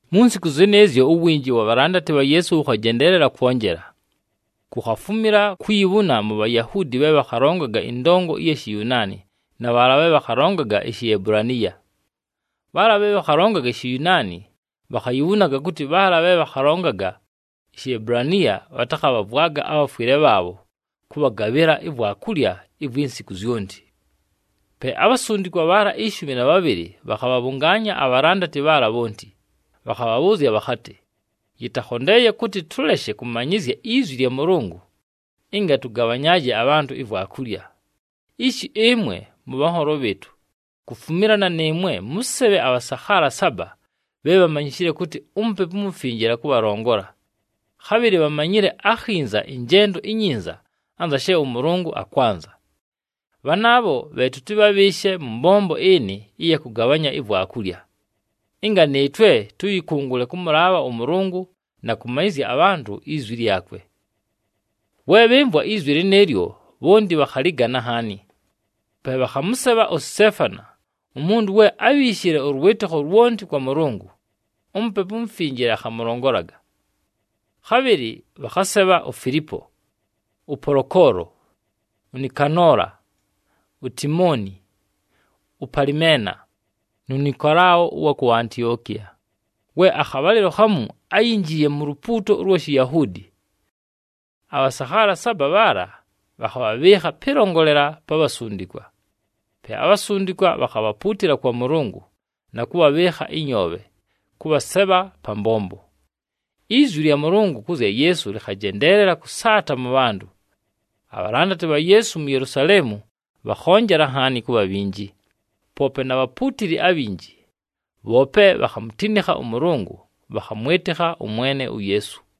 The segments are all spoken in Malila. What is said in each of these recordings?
Mu nsiku zɨnɨɨzyo uwinji wa bhalandati bha Yeesu wʉkhajendeelela kwonjela. Kukhafumila kuyibhuna mu Bhayahuudi bhe bhakhalongaga ɨndongo ɨya Shiyunaani na bhaala bhe bhakhalongaga iShiebulaniya. Bhaala bhe bhakhalongaga iShiyunaani bhakhayibhunaga kʉtɨ bhaala bhe bhakhalongaga iShiebulaniya bhatakhabhavwaga abhafwɨle bhaabho kʉbhagabhɨla ivwakulya ivwi nsiku zyonti. Pe abhasundikwa bhaala ishumi na bhabhɨlɨ bhakhabhabhʉngaanya abhalandati bhaala bhonti, bhakhabhabhʉʉzya bhakhatɨ, “Yɨtakhondeeye kʉtɨ tʉleshe kʉmanyɨzya izwi lya Mʉlʉngʉ, ɨnga tʉgabhanyaaje abhantʉ ivwakulya. Ishi ɨmwe mʉbhanholo bhɨɨtʉ, kufumilana nɨɨmwe mʉsebhe abhasakhaala saba bhe bhamanyishile kʉtɨ uMupepu uMufinjile akʉbhalongola, khabhɨlɨ bhamanyile akhinza ɨnjendo inyinza anza she ʉMʉlʉngʉ akwanza. Bhanaabho bhe tʉtɨbhabhɨɨshe mʉ mbombo ɨnɨ ɨya kʉgabhanya ivwakulya, ɨnga nɨɨtwe tʉyɨkʉngʉle kʉmʉlaabha ʉMʉlʉngʉ, na kʉmanyɨzya abhantʉ izwi lyakwe.” We bhɨmvwa izwi lɨnɨɨlyo, bhonti bhakhalɨgana nhaani. Pe bhakhamʉsebha uSiteefani, umuntu we ábhiishile ʉlwɨtɨkho lwonti kwa Mʉlʉngʉ, uMupepu uMufinjile akhamʉlongolaga. Khabhɨlɨ bhakhasebha uFilipo, ʉPolokolo, uNikanola, uTimoni, uPalimena, nu Nikolao ʉwa ku Antiokiya, we akhabhalɨlo khamu áyinjiiye mu lupuuto ʉlwa Shiyahuudi. Abhasakhaala saba bhaala bhakhabhabhɨɨkha pɨlongolela pa bhasundikwa. Pe abhasundikwa bhakhabhapuutila kwa Mʉlʉngʉ, na kʉbhabhɨɨkha ɨnyoobhe, kʉbhasebha pa mbombo. Izwi lya Mʉlʉngʉ kʉ zya Yeesu lɨkhajendeelela kʉsaata mʉ bhantʉ. Abhalandati bha Yeesu mu Yelusaleemu bhakhonjela nhaani kʉbha bhinji, poope na bhapuutili abhinji, bhoope bhakhamutinikha ʉMʉlʉngʉ, bhakhamwɨtɨkha ʉMwene uYeesu.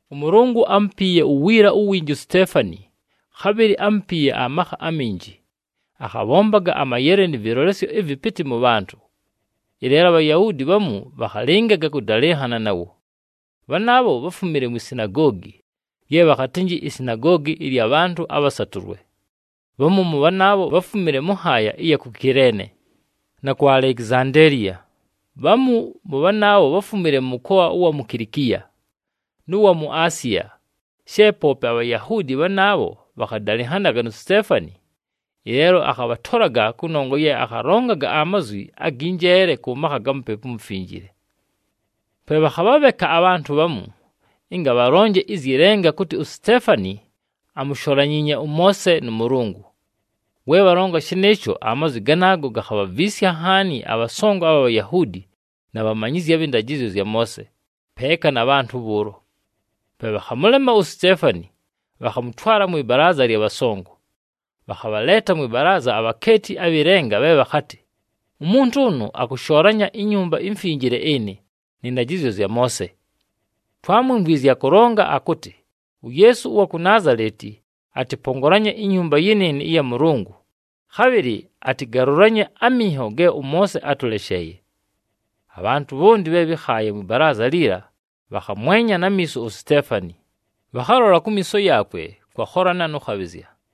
ɄMʉlʉngʉ ámupiiye uwiila uwinji uSiteefani, khabhɨlɨ ámupiiye amakha aminji, akhabhombaga amayele nɨ vɨlolesyo ɨvɨpɨtɨ mʉ bhantʉ. Ɨleelo aBhayahuudi bhamu bhakhalɨngaga kʉdalɨnhana nawo. Bhanaabho bháfumile mwi sinagoogi, lye bhakhatɨnjɨ iSinagoogi ɨlya Bhantʉ aBhasatʉlwe. Bhamu mʉ bhanaabho, bháfumile mʉ nhaaya ɨya ku Kileene, na ku Alekizandeeliya, bhamu mʉ bhanaabho bháfumile mʉ mʉkoa ʉwa mu Kilikiya, nʉ wa mu Asiya. She poope aBhayahuudi bhanaabho bhakhadalɨnhanaga nu Siteefani, ɨleelo akhabhatolaga kʉnongwa ye akhalongaga amazwi agɨ njeele kʉ makha ga Mupepu uMufinjile. Pe bhakhabhabheka abhantʉ bhamu, ɨnga bhalonje ɨzyɨ lenga kʉtɨ uSiteefani amusholanyiinye ʉMoose, nʉ Mʉlʉngʉ. We bhalonga shɨnɨɨsho, amazwi ganaago gakhabhaviisya nhaani abhasongo abha Bhayahuudi na bhamanyizyi abhɨ ndajɨzyo zya Moose, peeka na bhantʉ bhʉʉlo. Pe bhakhamʉlema uSiteefani, bhakhamʉtwala mwɨ balaaza lya bhasongo. Bhakhabhaleeta mwɨ balaaza abhakeeti abhɨ lenga bhe bhakhatɨ, “Umuntu ʉnʉ akʉshoolanya iNyumba iMfinjile ɨnɨ, nɨ ndajɨzyo zya Moose! Twámwimvwizye akʉlonga akʉtɨ uYeesu ʉwa ku Naazaleti atɨpongolanye inyumba yɨnɨɨnɨ ɨya Mʉlʉngʉ, khabhɨlɨ atɨgalʉlanye aminho ge ʉMoose átʉlesheeye.” Abhantʉ bhonti bhe bhɨkhaaye mwɨ balaaza liila bhakhamwenya na miiso uSiteefani, bhakhalola kumiiso yaakwe kwakholana nʉ khabhɨzya.